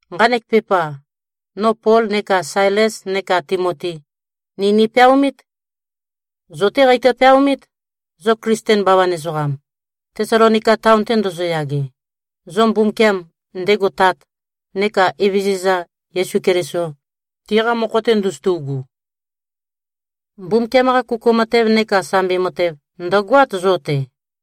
Nqanek pepa, no Pol neka Sailes neka Timoti, ni nipeaomít. Zo-té qeitø-peaomít, zo Klisten bawan ezoqam, Tesalonika taon-te ndozoyage, zo Mbumbukiam, ndego Tat, neka Evezøza, Yesu Keliso, tiqa mokho-te ndozotu꞉gu. Mbumbukiam-qa kuku matev neka sambi matev, ndø̀goát, zo-te.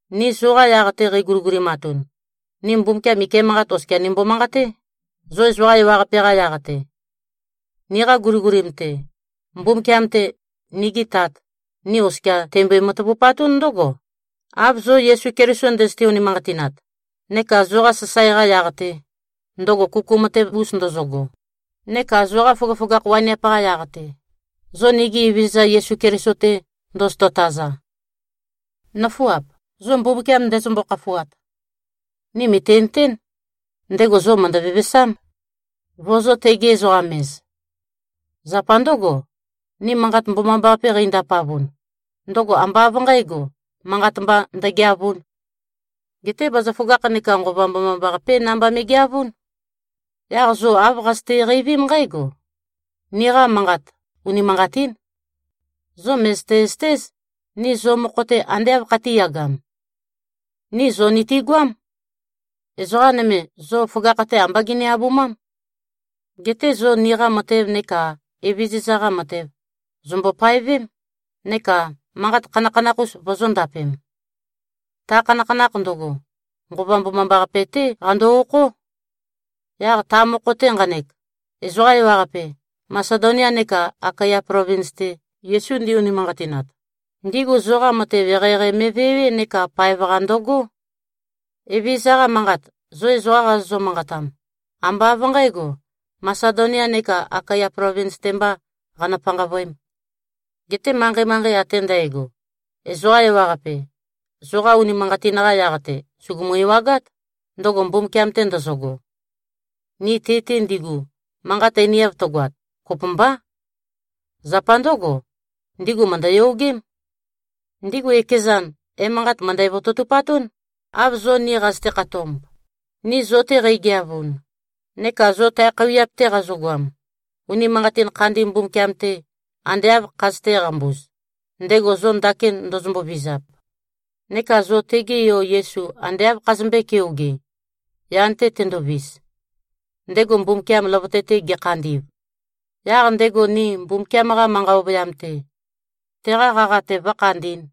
Ni zoqa yaq-te qeiguligulimatun, ni Mbumbukiam ike manqat oskia nimbo-manqaté, zo ezoqa ewaqape-qa yaq-te. Niqa guligulim-te, Mbumbukiam-te, nigi Tat, ni oskia teimbo-matavupatún ndǿgo, av zo Yesu Keliso ndøzøte-unimanqatinat, neka zoqa sasae-qa yaq-te, ndøgo kuku matev-us ndozogo, neka zoqa føgøføgakh waniap-qa yaq-te, zo nigi Evezøza Yesu Keliso-te ndozoto-taza. Nǿfuap, zo Mbumbukiam ndezømbo-khafuat, ni mø̀tinøtén, ndego zo mø̀ndø-vevesám, vozō-tegi-ezoqam-ez. Zapa ndǿgo, ni Manqat Mbomambaqape qeindapavun, ndøgo ambá av nqǣgo, manqat mba ndøgeavūn. Geté bazaføgakh neka Nqova Mbomambaqapé namba me꞉geavún. Yaq zo āv qazøte-qeivím nqǽgo: Niqa manqat unimanqatín. Zo mø̀zøte-zøtéz, ni zo mokho-te ande āv khatīyagam. Ni zo nitigoám. Ezoqa nøme, zo føgakh-te ambá gini-abumám. Geté zo niqa matev neka Evezøza-qa matev, zòmbo-paevém neka manqat khanakhanakh-us vozōndapem. Ta khanakhanakh ndøgo, Nqova Mbomambaqape-té qando-okhó. Yaq ta mokho-te nqanek, ezoqa ewaqape, Masedonia neka Akaya plovins-te, Yesu ndi-unimanqatinat, ndigu zoqa matev eqeieqei me꞉vewé neka paev-qa ndøgó. Evezøza-qa manqat, zo ezoqa qazozø-manqatam, ambá av nqǣgo, Masedonia neka Akaya plovins-te mbā qanø-panqavøēm. Geté manqei-manqei ate ndægo, ezoqa ewaqape, zoqa unimanqatin-qa yaq-te sùgumu-ewagát, ndøgo Mbumbukiam-te ndøzøgo. Ni ti-te ndigu, manqat einiav tøgoat, kopømbá. Zapa ndǿgo, ndigu mø̀ndøyogém. Ndigu ekezan, emanqat mø̀ndæ-vototupatún, av zo ni qazøte-khatomb, ni zo-te qeigeavun, neka zo tae khøuwiap-te qazogoam, unimanqatin khandi Mbumbukiam-te ande āv khazøtē-qambuz, ndego zo ndakin ndozombo-vizap, neka zo tege Yo Yesu ande āv khazømbøē-keoge, yan-te tendovis, ndego Mbumbukiam løvøte-te gekhandi꞉v, yaq ndego ni Mbumbukiam-qa manqa ovøyam-te, teqa qaqa-te vǿkhandī꞉n.